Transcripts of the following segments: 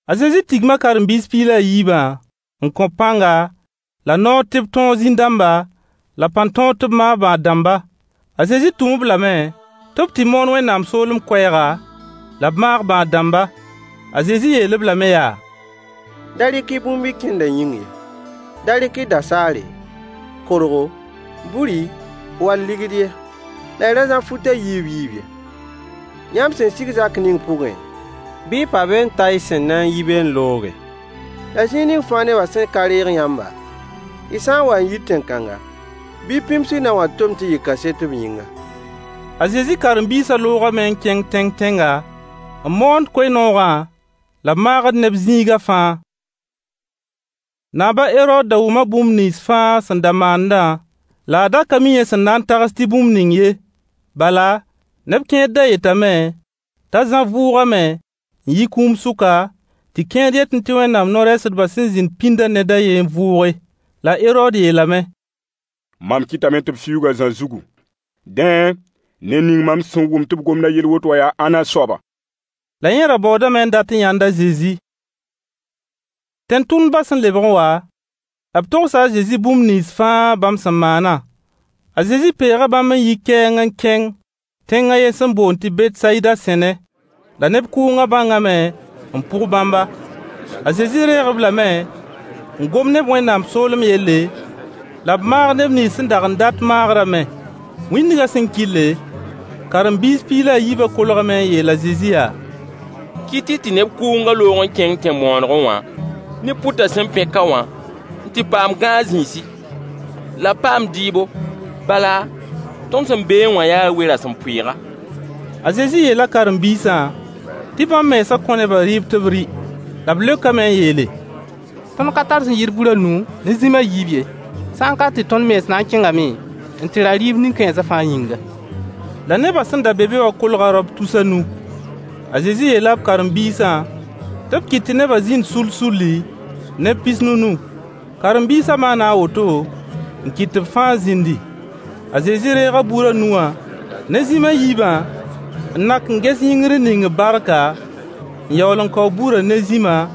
A Zezi tigma karen-biis piig la a yiibã n kõ-b pãnga la noor tɩ b tõog zĩn-dãmba, la pãn-tõog tɩ b maag bãad-dãmba. A Zezi tʋm-b lame tɩ b tɩ moon Wẽnnaam soolem koɛɛga, la b maag bãad-dãmba. A Zezi yeel-b lame yaa: Da rɩk-y bũmb y kẽnda yĩng ye. Da rɩk-y da-saare, korgo, buri wall ligd ye. La y ra zã fut a yiib yiib ye. Yãmb sẽn sig zak ning pʋgẽ, bɩ y pa be n ta y sẽn na n yi be n looge. La zĩig ning fãa nebã sẽn ka reeg yãmba, y sã n wa n yit tẽn-kãnga, bɩ y pĩms y nao wã tom tɩ yɩ kaset b yĩnga. A Zezi karen-biisã loogame n kẽng tẽng tẽnga, n moond koe-noogã, la b maagd neb zĩiga fãa. Naab a Herood da wʋma bũmb nins fãa sẽn da maandã, la a da ka mi yẽ sẽn na n tags tɩ bũmb ning ye. Bala, neb kẽer da yetame t'a Zã vʋʋgame n yi kũum sʋka, tɩ kẽer yetẽ tɩ Wẽnnaam no-rɛɛsdbã sẽn zĩnd pĩndã ned a ye n vʋʋge. La Herood yeelame: Mam kɩtame tɩ b fiuug a Zã zugu. Dẽ, ned ning mam sẽn wʋmd tɩ b gomd a yell woto wã yaa ãnna soaba? La yẽ ra baoodame n dat n yãnd a Zezi. Tẽn-tʋmdbã sẽn lebg n wa, b togsa a Zezi bũmb nins fãa bãmb sẽn maanã. A Zezi peega bãmb n yi kɛɛng n kẽng tẽng a yen sẽn boond tɩ Betsayida sẽne. La neb kʋʋngã bãngame n pʋg bãmba. A Zezi reeg-b lame n gom ne-b Wẽnnaam soolem yelle, la b maag neb nins sẽn dag n dat maagrã me. Wĩndgã sẽn kɩlle, karen-biis piig la yiibã kolgame n yeel a Zezi yaa: Kɩt-y tɩ neb kʋʋngã loog n kẽng tẽn-bõonegẽ wã ne pʋtã sẽn pẽ ka wã n tɩ paam gãag zĩisi, la b paam dɩɩbo. Bala, tõnd sẽn beẽ wã yaa we-rasempʋɩɩga. A Zezi yeela karen-biisã tɩ bãmb mensã kõ nebã rɩɩb tɩ b rɩ. La b leokame n yeele: Tõnd ka tar sẽn yɩɩd bur a nu ne zĩm a yiib ye. Sã n ka tɩ tõnd mens na n kẽngame n tɩ ra rɩɩb nin-kãensã fãa yĩnga. La nebã sẽn da be be wã kolga raop tus a nu. A Zezi yeela b karen-biisã tɩ b kɩt tɩ neba zĩnd sull-sulli, neb pis-nunu. Karen-biisã maana a woto n kɩt tɩ b fãa zĩndi. A Zezi reega bur a nu wã ne zĩm a yiibã n nak n ges yĩngr n ning-b barka, n yaool n kao burã ne zĩma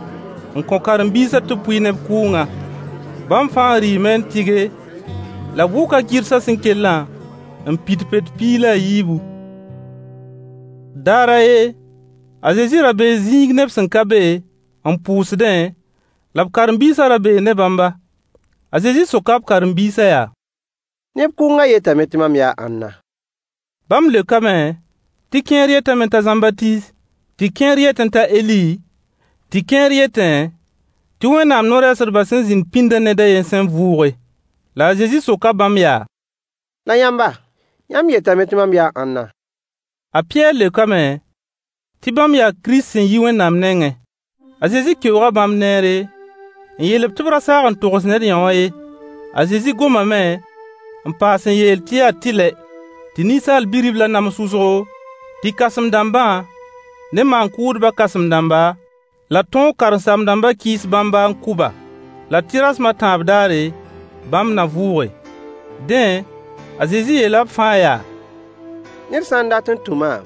n kõ karen-biisã tɩ b pʋɩ neb kʋʋngã. Bãmb fãa rɩɩme n tɩge, la b wʋka gɩrsã sẽn kellã n pid pet piig la a yiibu. Daar a ye, a Zezi ra bee zĩig neb sẽn ka be, n pʋʋsdẽ, la karen-biisã ra bee ne bãmba. A Zezi soka b karen-biisã yaa: Neb kʋʋngã yetame tɩ mam yaa ãnna? Bãmb leokame tɩ kẽer yetame t'a Zãmbatiis, tɩ kẽer yetẽ t'a Eli, tɩ kẽer yetẽ tɩ Wẽnnaam no-rɛɛsdbã sẽn zĩnd pĩndã ned a ye sẽn vʋʋge. La a Zezi soka bãmb yaa: La yãmba, yãmb yetame tɩ mam yaa ãnna? A Pɩyɛɛr leokame tɩ bãmb yaa Kirist sẽn yi Wẽnnaam nengẽ. A Zezi keooga bãmb neere, n yeel-b tɩ b ra saag n togs ned yõwã ye. A Zezi gomame n paas n yeel tɩ yaa tɩlɛ tɩ Ninsaal Bi-riblã nams wʋsgo, tɩ kãsem-dãmbã ne maan-kʋʋdbã kãsem-dãmba la tõog karen-saam-dãmbã kɩɩs bãmba n kʋ-ba, la tɩ rasem a tãab daare bãmb na vʋʋge. Dẽ, a Zezi yeela b fãa yaa: ned sã n dat n tũ maam,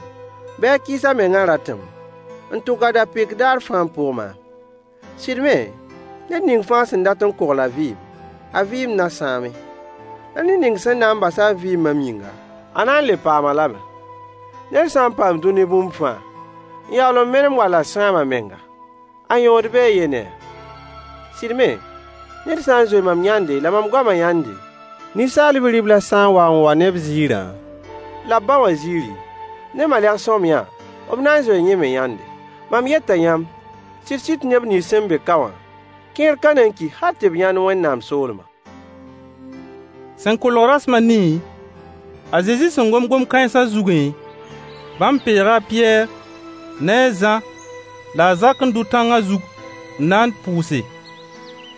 bɩ a kɩɩs a mengã ratem, n tʋk a da-pɩk daar fãa n pʋg maam. Sɩd me, ned ning fãa sẽn dat n kogl a vɩɩm, a vɩɩm na sãame. La ned ning sẽn na n bas a vɩɩm mam yĩnga, a na n le paam-a lame. Ned sã n paam dũni bũmb fãa, n yaool n menem wall a sãam a menga, a yõod bee yɛ ne-a? Sɩd me, ned sã n zoe mam yãnde la mam goama yãnde, Ninsaal Bi-riblã sã n wa n wa ne b ziirã, la b ba wã ziiri, ne malegs-sõamyã, b na n zoee yẽ me yãnde. Mam yeta yãmb sɩd-sɩd tɩ neb nins sẽn be ka wã kẽer ka na n ki hal tɩ b yãnd Wẽnnaam soolmã. Sẽn kolg rasem a nii, a Zezi sẽn gom gom-kãensã zugẽ, bãmb peega a Pɩyɛɛr ne a Zã la a Zak n dʋ tãngã zug n na n pʋʋse.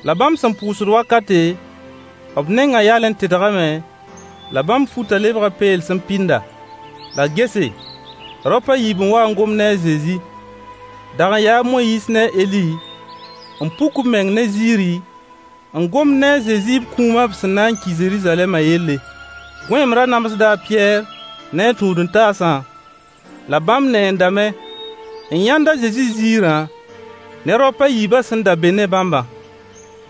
La bãmb sẽn pʋʋsd wakate, b nengã yalẽ tedgame, la bãmb futã lebga peels n pɩnda. La gese, raop a yiib n wa n gom ne a Zezi. Dag n ya a Moyiis ne a Eli, n puk b meng ne ziiri, n gomd ne a Zezi b kũuma b sẽn na n ki Zeruzalɛma yelle. Gõeem ra namsda a Pɩyɛɛr ne a tũud-n-taasã, la bãmb neendame n yãnd a Zezi ziirã ne raop a yiibã sẽn da be ne bãmbã.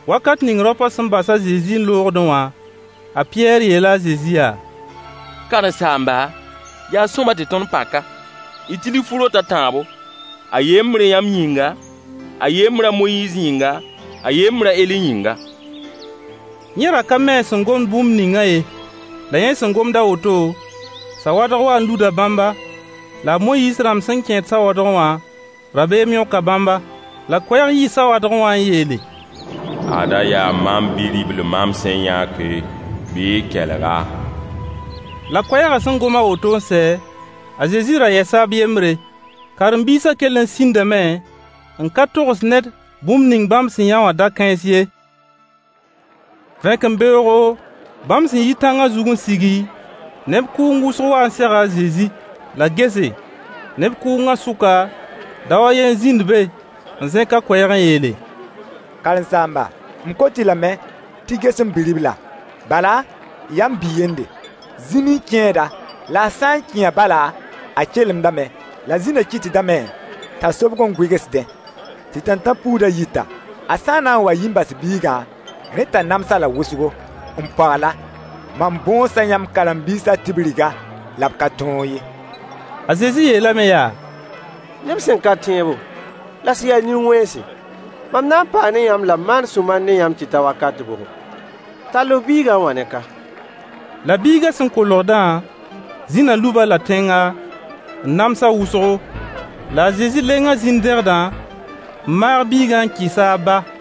Wakat ning raopã sẽn bas a Zezi n loogdẽ wã, a Pɩyɛɛr yeela a Zezi yaa: Karen-saamba, yaa sõama tɩ tõnd pa ka. D tilg fu-rot a tãabo: a yembr yãmb yĩnga, a yembr a Moyiis yĩnga, a yembr a Eli yĩnga. Yẽ ra ka mi a sẽn gomd bũmb ningã ye. La yẽ sẽn gomd a woto, sawadg waa n luda bãmba, la a Moyiis rãmb sẽn kẽed sawadgẽ wã, rabeem yõka bãmba. La koɛɛg yii sawadgẽ wã n yeele: Ada yaa mam Bi-ribl mam sẽn yãke, bɩ y kelg-a. La koɛɛgã sẽn gom a woto n sɛ, a Zezi ra yɛsa b yembre. Karen-biisã kell n sĩndame n ka togs ned bũmb ning bãmb sẽn yã wã da-kãens ye. Vẽkembeoogo, bãmb sẽn yi tãngã zug n sigi, neb kʋʋng wʋsg waa n sega a Zezi. La gese, neb kʋʋngã sʋka, dao a ye n zĩnd be n zẽk a koɛɛg n yeele: Karen-saamba, m kot-y lame tɩ y ges m bi-riblã. Bala, yaa m bi-yende. Zĩn n kẽed-a, la a sã n kẽ-a bala, a kelemdame, la zĩna kɩtdame t'a sobg n gʋɩgsdẽ, tɩ tãntãn-puudã yita. A sã n na n wa n yi n bas biigã, rẽ t'a nams-a-la wʋsgo, n pogl-a. Mam bõosa yãmb karen-biisã tɩ b rig-a, la b ka tõog ye. A Zezi yeelame yaa: Neb sẽn ka tẽebo, la sẽn ya nin-wẽnse, mam na n paa ne yãmb la m maan sũ-mar ne yãmb tɩ ta wakat bʋgo? Tall f biigã n wa ne ka. La biigã sẽn kolgdã, zĩna lub-a-la tẽnga, n nams-a wʋsgo. La a Zezi lenga zĩn-dẽgdã, n maag biigã n kɩs-a a ba.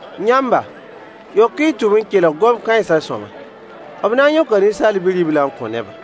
Yãmba, yok-y y tʋb n kelg gom-kãensã sõama: b na n yõka Ninsaal Bi-riblã n kõ neba.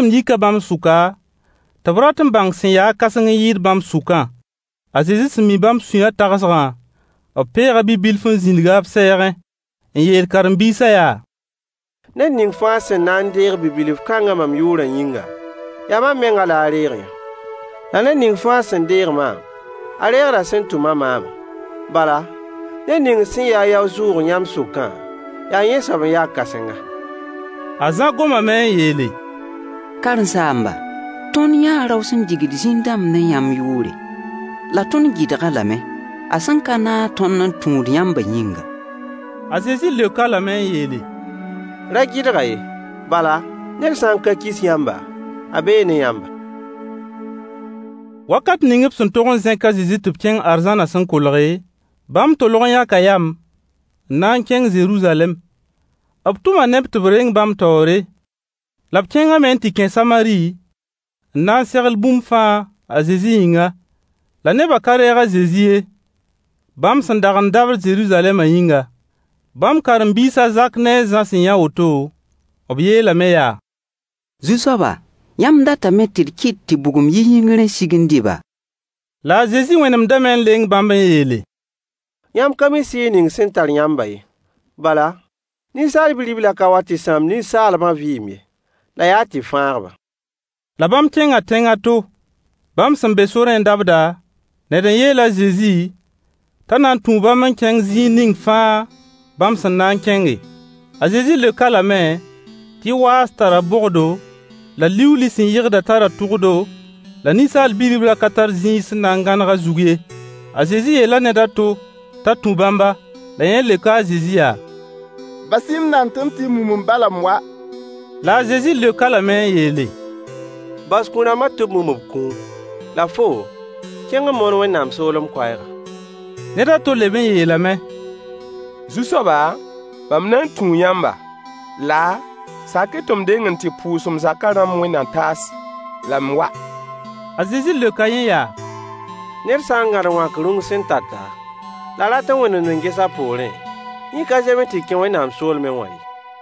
No-koeemd yika bãmb sʋka, tɩ b rat n bãng sẽn ya-a kãseng n yɩɩd bãmb sʋkã. A Zezi sẽn mi bãmb sũyã tagsgã, b peega bi-bilf n zĩnig-a b sɛɛgẽ n yeel karen-biisã yaa: ned ning fãa sẽn na n deeg bi-bilf kãngã mam yʋʋrã yĩnga, yaa mam mengã la a reeg-yã. La ned ning fãa sẽn deeg maam, a reegda sẽn tʋma maamã. Bala, ned ning sẽn ya-a yao-zʋʋg yãmb sʋkã, yaa yẽ soab n ya kãsenga. A Zã gomame n yeele: Karen-saamba, tõnd yãa rao sẽn digd zĩn-dãmb ne yãmb yʋʋre, la tõnd gɩdg-a lame, a sẽn ka naag tõnd n tũud yãmbã yĩnga. A Zezi leok-a lame n yeele: ra gɩdg-a ye. Bala, ned sã n ka kis yãmba, a bee ne yãmba. Wakat ning b sẽn tog n zẽk a Zezi tɩ b kẽng arzãnã sẽn kolge, bãmb tolg n yãka yam n na n kẽng Zeruzalɛm. B tʋma neb tɩ b reng bãmb taoore. La b kẽngame n tɩ kẽ Samari n na n segl bũmb fãa a Zezi yĩnga. La neba ka reeg a Zezi ye, bãmb sẽn dag n dabd Zeruzalɛma yĩnga. Bãmb karen-biis a Zak ne a Zã sẽn yã woto, b yeelame yaa: Zu-soaba, yãmb datame tɩ d kɩt tɩ bugum yi yĩngr n sig n dɩ-ba? La a Zezi wẽnemdame n leng bãmb [n yeele: yãmb ka mi sɩɩg ning sẽn tar yãmbã ye. Bala, Ninsaal Bi-riblã ka wa tɩ sãam ninsaalbã vɩɩm ye, la yaa tɩ fãag-ba.] La bãmb kẽnga tẽng a to. Bãmb sẽn be sorẽ n dabda, ned n yeel a Zezi t'a na n tũu bãmb n kẽng zĩig ning fãa bãmb sẽn na n kẽnge. A Zezi leok-a lame tɩ waas tara bogdo, la liuuli sẽn yɩgda tara tʋgdo, la Ninsaal Bi-riblã ka tar zĩig sẽn na n gãneg a zug ye. A Zezi yeela ned a to t'a tũ bãmba. La yẽ leoka a Zezi yaa: bas-y-m nand tɩ m tɩ mum m ba la m wa. La a Zezi leok-a lame n yeele: bas kũ-rãmbã tɩ b mum b kũum, la foo, kẽng n moon Wẽnnaam soolem koɛɛgã. Ned a to leb n yeelame: Zu-soaba mam na n tũu yãmba, laa, sak-y tɩ m deng n tɩ pʋʋs m zaka rãmb wẽnd-na-taas la m wa. A Zezi leoka yẽ yaa: ned sã n gãd wãk rũng sẽn tata, la a rat n wẽnemd n ges a poorẽ, yẽ ka zems tɩ kẽ Wẽnnaam soolma ye.